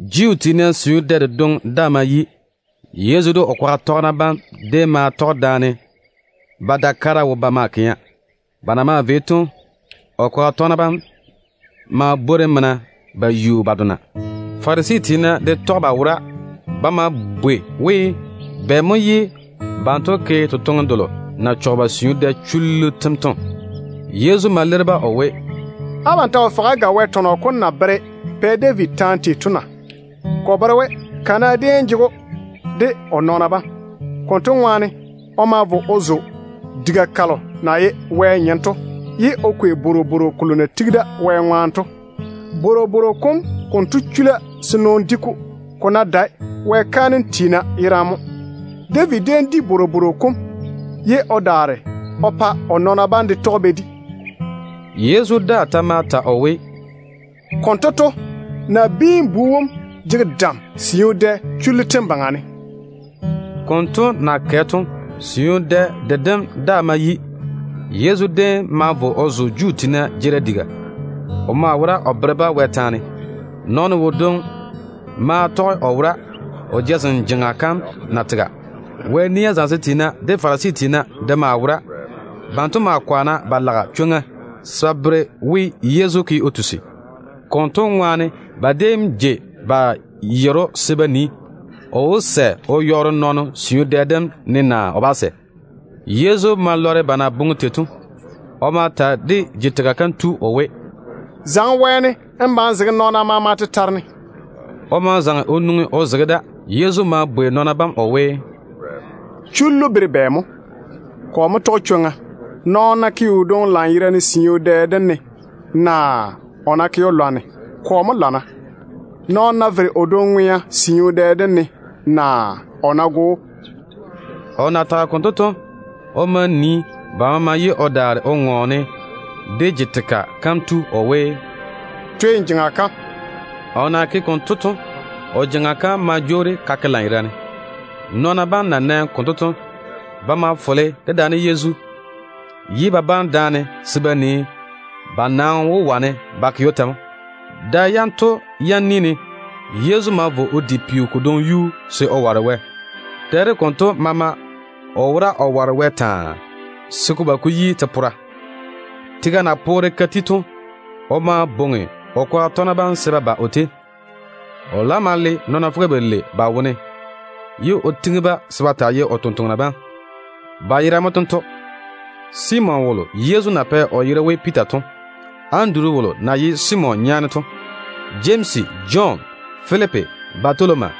Juu tiina siu dɛ dedwoŋi daa ma yi. Yezu de o kwaga tɔgena bam déem ma tɔge daane ba da kara wo ba maa kɛa. Ba na maa vei to, o kwaga tɔgena bam maa bwori mena ba yu ba dona. Farisi tiina de tɔge ba wora. Ba ma bwei we, bɛ mo ye banto ke totoŋe delo na chɔge dé siu dɛ chullu tem to? Yezu ma leiri-ba o we, “Abam ta wo fɔge á ga Wɛ tɔnɔ kom na bere Pɛ David taane tei to na? Ko bere we kana déem jege o de o nɔɔna bam. Konto ŋwaane o ma vo o zo Wɛ diga kam, ye o kwei bworobworo kolo na tigi da Wɛ ŋwaane to. Bworobworo kom konto chula se nɔɔno di-ko, ko ná dae Wɛ kaanem tiina yerane. David déem di bworobworo kom, ye o daare o pa o nɔɔna bam de tɔge ba di.” Yezu daa ta ma ta o we, “Konto to, Nabiin-bu wom jege dam siu dɛ chullu tem baŋa ne.” Konto na kɛ to, siu dɛ dedem daa ma yi. Yezu déem ma vo o zo Juu tiina jeerim diga. O maa wora o bere-ba Wɛ taane. Nɔɔno wodwoŋi maa tɔge o wora, o jazem jeŋa kam na tega. Wɛ nia zamesem tiina de Farisi tiina de maa wora. Banto maa kwaana ba lage chwoŋa se ba bere we Yezu ke o tusi. Konto ŋwaane ba déem jei ba yere‑o se ba nii, o wó sɛ o yɔɔre nɔɔno siu dɛ dem ne naa o bá sɛ. Yezu ma lɔre ba na boŋe tei to. O ma ta de je-tega kam tu o we, “Zaŋe wɛɛne n ba n zege nɔɔna maama tetare ne.” O ma zaŋe o nwoŋi o zege da. Yezu ma bwei nɔɔna bam o we, “Chullu bere we bɛ mo? Kɔ mo tɔge chwoŋa, nɔɔno ná ke o dwoŋi lanyerane siu dɛ dem ne, naa o ná ke‑o lwarem? Kɔ mo lana, nɔɔno ná vere o dwoŋi ŋwea siu dɛ dem ne, naa o ná go‑o?” O na tage konto to, o ma nii ba maama ye o daare o ŋɔɔne de je-tega kam tu o we, “Twe n jeŋa kam.” O na ke konto to, o jeŋa kam ma jwoori ka ke lanyerane. Nɔɔna bam na nɛ konto to, ba ma fole dedaane Yezu, ye ba bane daane se ba nii ba na wó wane ba ke‑o tei to. Da yam konto ni ne, Yezu ma vo o di peo kodwoŋi yuu se o ware Wɛ. Dɛ dem konto maama o wora o ware Wɛ taa, se ko ba ko yi te-pora. Tega na poore ka ti to, o ma bwoŋi o kwaga tɔgena bam se ba ba o tei. O laam ma le nɔɔna fuga-balei ba wone, ye o tiŋi-ba se ba taa ye o totoŋa nakwa bam. Ba yera mo tento: Simon wolo Yezu na pɛ o yere we Piita to. Anduru wolo na ye Simon nyaane to. Jemsi, de Jɔn, de Filipi, de Batoloma,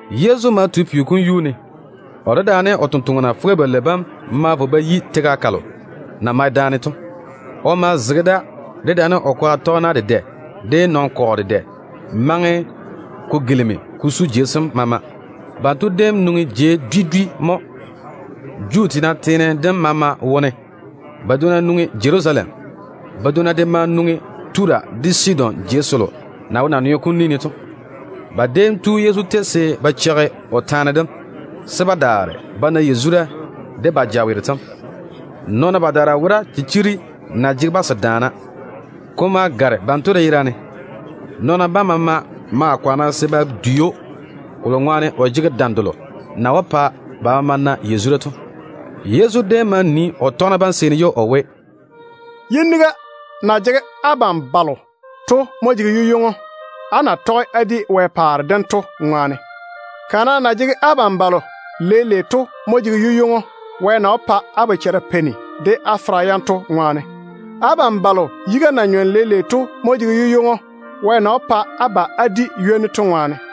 Yezu ma tu peo kom yuu ne. O dedaane o tontoŋena fuga-balei bam ma vo ba yi tega kalo na mae daane to. O ma zege da, dedaane o kwaga tɔgena dedɛ, de nɔn-kɔgɔ dedɛ maŋe ko gilimi ko su jei sem maama. Banto déem nwoŋi jei dwi dwi mo, Judea teene dem maama wone. Badwonna nwoŋi Jerusalem. Badwonna de ma nwoŋi Tura de Sidon jei selo na wo naneo kom ni ne to. Ba déem tu Yezu tei se ba cheigi o taane dem, se ba daare ba na yazura de ba jaweero tem. Nɔɔna badaara wora chichiri na jege-ba se daana. Ko ma gare banto de yera ne. Nɔɔna bam maama maa kwaana se ba dwei‑o, kolo ŋwaane o jege dam delo na wó pa ba maama na yazura to. Yezu déem ma nii o tɔgena bam seeni ye o we: “Yiniga na jege abam balo to mo jege yu-ywoŋo, á na tɔge á di Wɛ paare dem to ŋwaane. Kana na jege abam balo leile to mo jege yu-ywoŋo, Wɛ na wó pa á bochara peini de á fera yam to ŋwaane. Abam balo yiga na nyɔne leile to mo jege yu-ywoŋo, Wɛ na wó pa á ba á di ywoni to ŋwaane.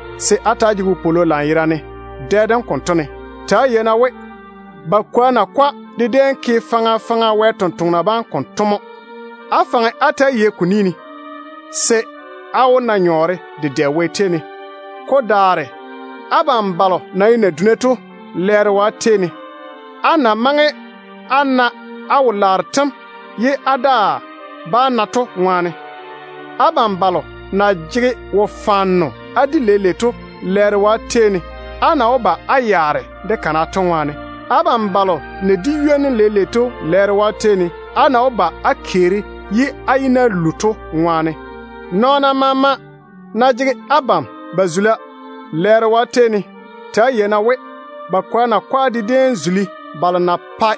se á ta‑á jege wopwolo lanyerane dɛ dem konto ne. Ta‑á yei-na we ba nabaara de déem ke faŋa faŋa Wɛ sampwori sem konto mo. Á faŋe á ta‑á yei ko ni ne, se á wó na nyɔɔre dedɛ Wɛ tei ne. Ko daare abam balo na ye naduna to, lɛɛro yi abam, á na maŋe á na á wo-laaro tem ye á daa bá na to ŋwaane. Abam balo na jege wodi-fɔrɔ á di leile to, lɛɛro yi abam, á na wó ba á yaare de kana to ŋwaane. Abam balo na di ywoni leile to, lɛɛro yi abam, á na wó ba á keeri ye á yi-na lu to ŋwaane. Nɔɔna maama ná jege abam ba zula, lɛɛro yi abam. Ta‑á yei-na we ba kwoa nakwa de déem zuli balo na pae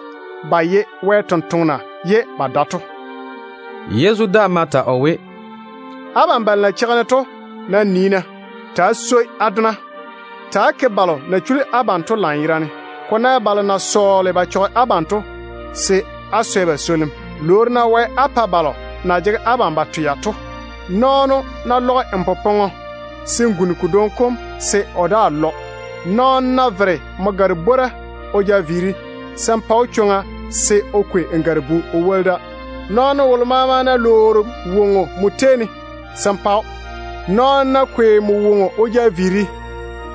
ba ye Wɛ sampwori ye ba dae to.” Yezu daa ma ta o we, “Abam balo na cheigi-ne to nam nii-na. Ta‑á swoi á dona. Ta‑á ke balo na chuli abam to lanyerane. Ko ná ye balo na sɔɔle ba chɔge abam to, se á swɛ ba swolim. Lwoori-na Wɛ á pa balo na jege abam ba twea to. Nɔɔno ná lɔge nmo popɔŋɔ, se n guni kodwoŋi kom se o daa lɔ. Nɔɔno ná vere nmo gare-bwora o ja viiri, se n pa‑o chwoŋa se o kwei n gare-bu o woli da. Nɔɔno wolo maama ná lwoori woŋo nmo tei ne, se n pa‑o. Nɔɔno ná kwei nmo woŋo o ja viiri,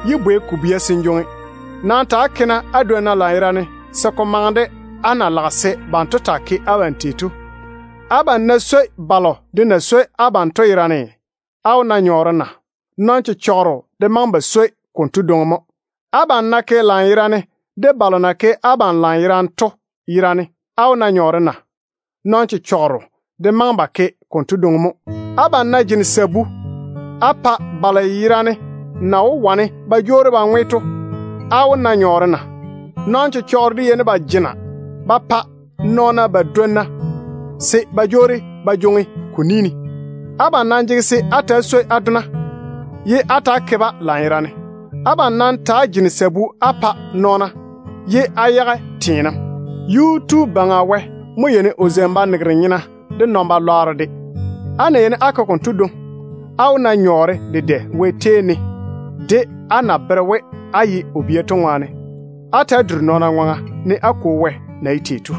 yé bwei ko bwia se n jwoŋi. Nam ta‑á ke-na á dwonna lanyerane, se ko maŋe de á na lage se banto taa ke abam tei to. Abam nam ná swoi balo de na swoi abam to yerane, á wó na nyɔɔre na? Nɔn-chechɔgero de maŋe ba swoi ba dwonna konto dwoŋi mo. Abam ná ke lanyerane de balo na ke abam lanyerane to yerane, á wó na nyɔɔre na? Nɔn-chechɔgero de maŋe ba ke konto dwoŋi mo. Abam ná jene sabu á pa balo yerane na wó wane ba jwoori ba ŋwe to, á wó na nyɔɔre na? Nɔn-chechɔgero de yeini ba jena ba pa ba dwonna se ba jwoori ba jwoŋi ko ni ne. Abam nam jege se á ta‑á swoi á dona, ye á ta‑á ke-ba lanyerane. Abam nam ta‑á jene sabu á pa nɔɔna, ye á yage teenem. Yuu-tu Baŋa Wɛ mo yeini o zeini banegero nyena de puseŋ-nyena mo. Á ná yeini á ke konto dwoŋi, á wó na nyɔɔre dedɛ Wɛ tei ne, de á na bere we á ye o bia tei to. Ta‑á duri-na nɔɔna ŋwaŋa, ne á Kwo Wɛ na ye tei to.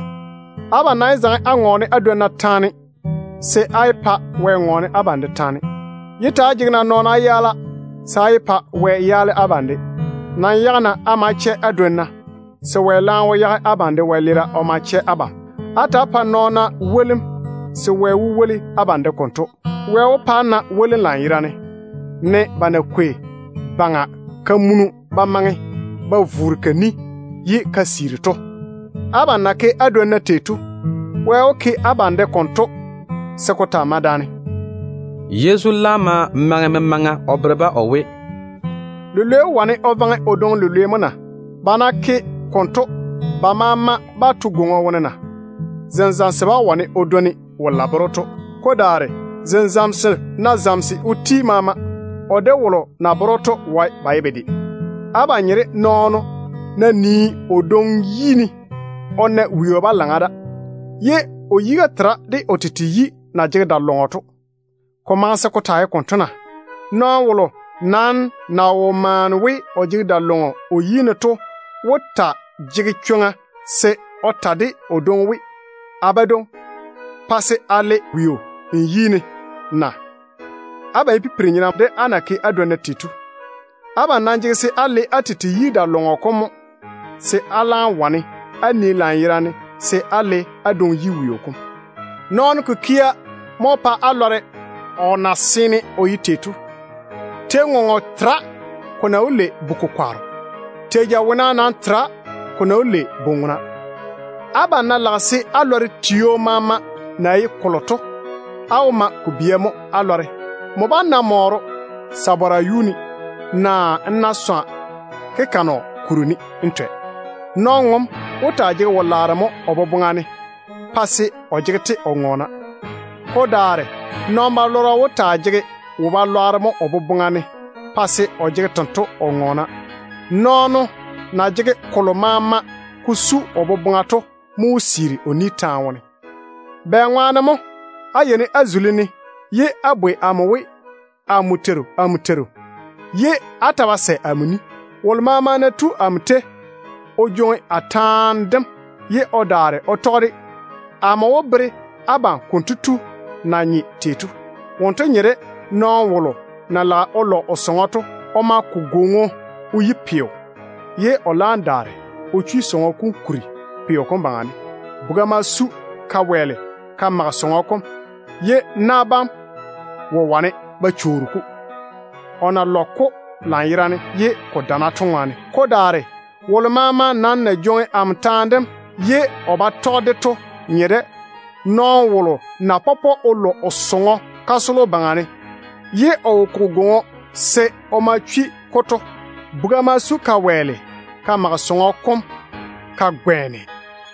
Abam nam yé zaŋe á ŋɔɔne á dwonna taane, se á yé pa Wɛ ŋɔɔne abam de taane. Yé ta‑á jege-na nɔɔna á yaala, se á yé pa Wɛ yaale abam de. Nam yage-na á ma chɛ á dwonna, se Wɛ laam wó yage abam de wɛleera o ma chɛ abam. Ta‑á pa-na nɔɔna wolim, se Wɛ wó woli abam de konto. Wɛ wó pa á na wolim lanyerane, ne ba na kwei bɔŋa ba maŋe ba vuuri ka ni ye ka siiri to. Abam na ke á dwonna tei to, Wɛ wó ke abam de konto se ko taa mae daane.” Yezu laam ma maŋe memaŋa o bere-ba o we: “Lilwei wó wane o vaŋe o dwoŋi lilwei mo na? Ba ná ke konto, ba maama bá to gwoŋo wone na? Zenzamso bá wane o dwoni wolo na bere‑o to. Ko daare zenzamso ná zamese o ti maama, o de wolo na bere‑o to wae ba ye bedwe. Abam nye de nɔɔno ná nii o dwoŋi yi ne o na weo balaŋa da, ye o yiga tera de o tete yi na jege da-lɔŋɔ to. Ko maŋe se ko taa ye konto na? Nɔɔno wolo ná wo maane we o jege da-lɔŋɔ o yi ne, kotu wó taa jege chwoŋa se o ta de o dwoŋi we, ‘A badwoŋi, pa se a le weo n yi ne’ na? Abam ye pipiri-nyena de á na ke á dwonna tei to. Abam nam jege se á le á tete yi da-lɔŋɔ kom mo, se á laam wane á nii lanyerane se á le á dwoŋi yi weo kom. Nɔɔno kikia wó pa á lɔre o na seene o ye tei to. Tei-ŋoŋo tera ko na wó lei bu-kokwaaro. Tei-jawona nam tera ko na wó lei bu-ŋona. Abam ná lage se á lɔre tio maama na ye kolo to, á wó ma ko bia mo á lɔre. Nmo bá‑n na mɔɔro sabara yuu ne, naa n na swa kaligwoŋo o kuri ne n twɛ. Nɔn-ŋom wó taa jege wo-laaro mo o boboŋa ne pa se o jege-te o ŋɔɔna. Ko daare nɔn-balɔrɔ wó taa jege wo-balwaaro mo o boboŋa ne pa se o jege tento o ŋɔɔna. Nɔɔno na jege kolo maama ko su o boboŋa to mo wó siiri o ni taane wone. Bɛŋwaane mo á yeini á zuli-ne ye á bwoi amo we, ‘Dé Teiru, dé Teiru’, ye á ta ba sɛ amo ni? Wolo maama ná tu amo tei o jwoŋi a taane dem ye o daare o tɔge-de, amo wó bere abam konto tu na nye tei to. Wonto nye de nɔɔno wolo na lage o lɔ o sɔŋɔ to. O ma ko gwoŋo o yi pelɔrɔ, ye o laam chwi sɔŋɔ kom kuri pelɔrɔ kom baŋa ne. Buga ma su ka wɛɛle ka mage sɔŋɔ kom, ye na bam wo wane ba chwoori-ko, o na lɔge-ko lanyerane ye ko dana to ŋwaane. Ko daare wolo maama nam na jwoŋi amo taane dem ye o ba tɔge-de to nye de nɔɔno wolo na pɔpɔ o lɔ o sɔŋɔ kasolo baŋa ne, ye o wo koge gwoŋo se o ma chwi-ko to. Buga ma su ka wɛɛle ka mage sɔŋɔ kom ka gwɛɛne,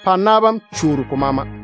pa na bam chwooli ko maama.”